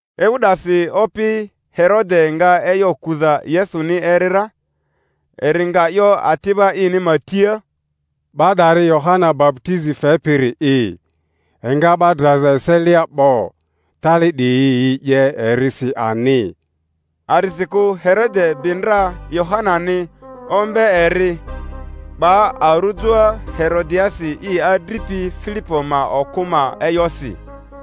Ewu 'dasi opi Herode nga e'yo kuza Yesuni eri ra; eri nga 'yo ati'ba ini ma tia, 'Ba 'dari Yohana baputizi fepiri'i, enga 'ba draza eselia 'bo; tali 'diyi yi 'ye erisi ani. A'disikᴜ Herode bi ndra Yohanani, ombe eri, 'ba arujoa Herodiasi i adripi Filipo ma okᴜ ma e'yosi;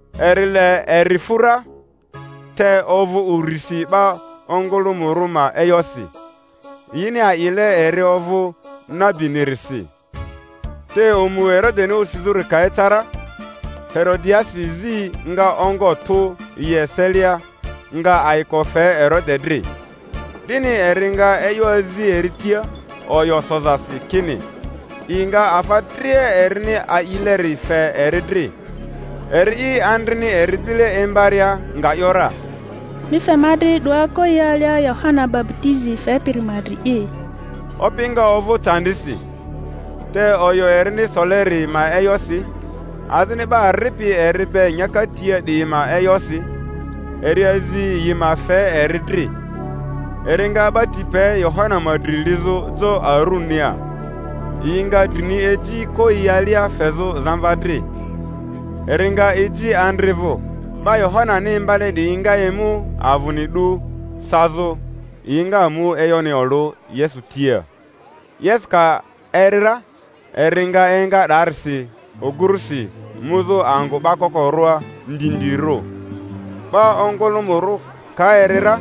Eri le eri fu ra, te ovᴜ urisi 'ba ongᴜlᴜmᴜrᴜ ma e'yosi, yini a'ile eri ovᴜ nabinirisi. Te omu Herodeni osizᴜri ka eca ra, Herodiasi zi nga ongo tᴜ yi eselia, nga ayiko fe Herode dri, 'dini eri nga e'yo azi eri tia oyo sozasi kini i nga afa dria erini a'ileri fe eri dri. Eri'i, andrini eri bile imbaria, nga ‘yora, Mi fe ma dri 'doa koyia alia Yohana baputizi fepiri ma dri'i. Opi nga ovᴜ candisi; te oyo erini soleri ma e'yosi, azini 'ba ripi eri be nyaka tia 'diyi ma e'yosi, eri azi yi ma fe eri dri; eri nga 'ba ti pe Yohana ma dri lizᴜ jo arunia, yi nga drini eji koyia alia fezᴜ zamva dri, eri nga eji andri vᴜ. 'Ba Yohanani imbale 'diyi nga emu avᴜni 'du sazᴜ; yi nga mu e'yoni olᴜ Yesu tia. Yesu ka eri ra, eri nga enga 'daarisi ogurᴜsi, muzᴜ angᴜ 'ba kokorᴜa ndindirᴜ. 'Ba ongᴜlᴜmᴜrᴜ ka eri ra,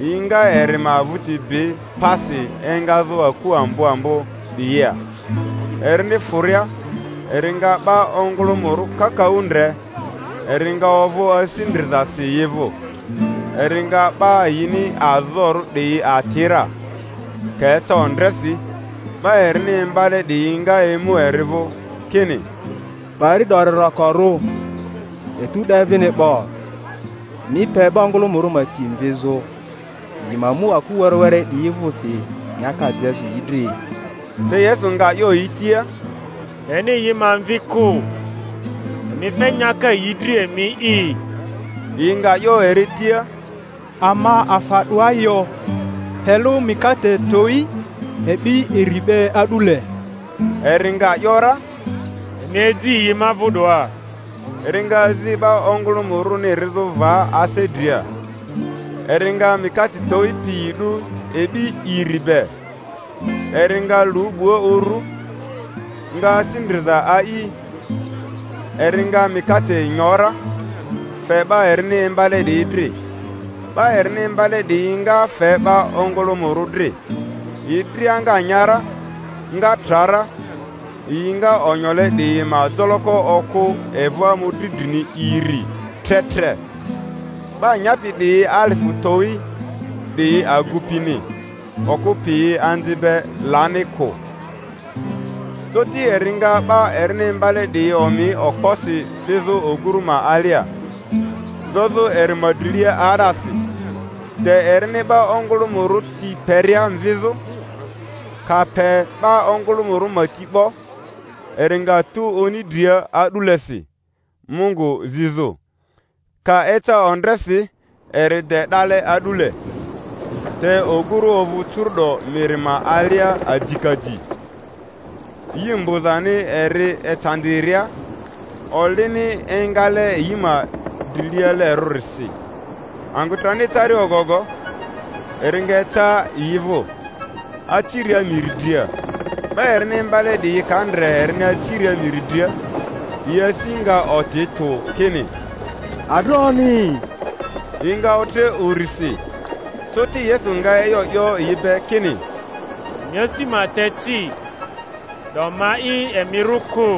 yi nga eri ma vᴜti bi pasi engazᴜ aku ambo ambo 'diyia. Erini fᴜria, eri nga 'ba ongᴜlᴜmᴜrᴜ kakaᴜ ndre, eri nga ovᴜ asi ndrizasi yi vᴜ, eri nga 'ba yini azorᴜ 'diyi ati ra. Ka eca ondresi, 'ba erini imbale 'diyi nga emu eri vᴜ, kini, Pari 'dori rokorᴜ, etu 'de vini 'bo; mi pe 'ba ongᴜlᴜmᴜrᴜ ma ti mvizᴜ, yi ma mu aku were were 'diyi vᴜsi nyaka jezᴜ yi dri. Te Yesu nga 'yo yi tia, Leni yi ma mvi kᴜ; emi fe nyaka yi dri emi'i. Yi nga 'yo eri tia, Ama afa 'doa yo, pe lᴜ mikate towi e'bi iri be a'dule. Eri nga ‘yora, Emi eji yi ma vᴜ 'doa. Eri nga azi 'ba ongᴜlumᴜrᴜni rizᴜ va ase dria, eri nga mikate towi piyi 'du e'bi iri be, eri nga lu 'bua uru, nga asi ndriza a'i, eri nga mikate nyo ra, fe 'ba erini imbale 'diyi dri, 'ba erini imbale 'diyi nga fe 'ba ongᴜlᴜmᴜrᴜ dri. Yi dria nga nya ra, nga tra ra. Yi nga onyole 'diyi ma joloko okᴜ evᴜ mᴜdri drini iri tre tre. 'Ba nyapi 'diyi alifᴜ towi 'diyi agupini; okᴜ piyi anzi be lani kᴜ. Coti eri nga 'ba erini imbale 'diyi omi okposi fizᴜ oguru ma alia, zozᴜ eri ma drilea 'aa'dasi, de erini 'ba ongᴜlᴜmᴜrᴜ ti peria mvizᴜ. Ka pe 'ba ongᴜlᴜmᴜrᴜ ma ti 'bo, eri nga tu oni dria a'dulesi Mungu zizᴜ. Ka eca ondresi eri de 'dale a'dule, te oguru ovᴜ curu’do miri ma alia adikadi, yi mbᴜzani eri ecandiria; olini engale yi ma drilialerᴜrisi. Angᴜ trani ecaria ogogo eri nga eca yi vᴜ, aciria miri dria. 'Ba erini imbale 'diyi ka ndre erini aciria miri dria, yi asi nga oti tᴜ, kini, Adroni! Yi nga otre urisi. Coti Yesu nga e'yo 'yo yi be kini, Emi asi ma te ci, 'do ma'i; emi rᴜ kᴜ.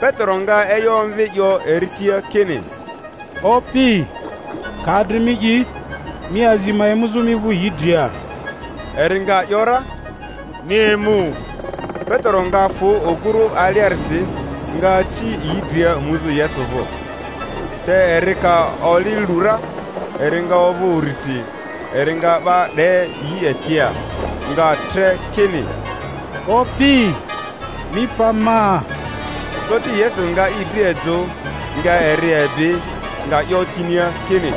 Petero nga e'yo omvi, 'yo eri tia kini, Opi, ka adri mi'i, mi azi ma emuzᴜ mi vᴜ yi dria. Eri nga ‘yora, Mi emu. Petero nga fᴜ oguru aliarisi, nga aci yi dria muzᴜ Yesu vᴜ; te eri ka oli lu ra, eri nga ovᴜ urisi; eri nga 'ba 'de yi etia, nga tre kini, Opi, mi pa ma! Coti Yesu nga i dri ejᴜ, nga eri ebi, nga 'yo tinia kini,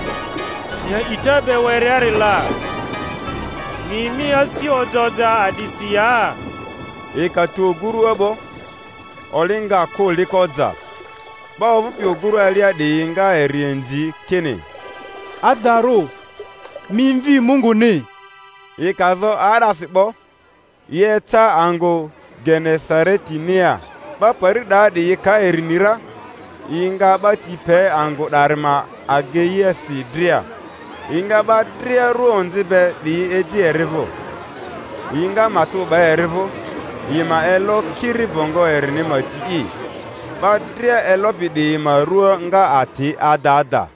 Mi a'ita be wereri la, mi mi asi oja oja a'disi ya? Yi ka tu ogurua 'bo, oli nga kᴜ liko ja. 'Ba ovᴜpi ogurᴜ alia 'diyi nga eri inzi kini, Adarᴜ mi Mvi Munguni. Yi ka zo 'aa'dasi 'bo, yi eca angᴜ Genesaretinia. 'Ba pari 'daa 'diyi ka eri ni ra, yi nga 'ba ti pe angᴜ 'dari ma ageiasi dria, yi nga 'ba dria rua onzi be 'diyi eji eri vᴜ, yi nga matᴜ 'ba eri vᴜ yi ma elo kiri bongo erini ma ti'i; 'ba dria elopi 'diyi ma rua nga ati ada ada.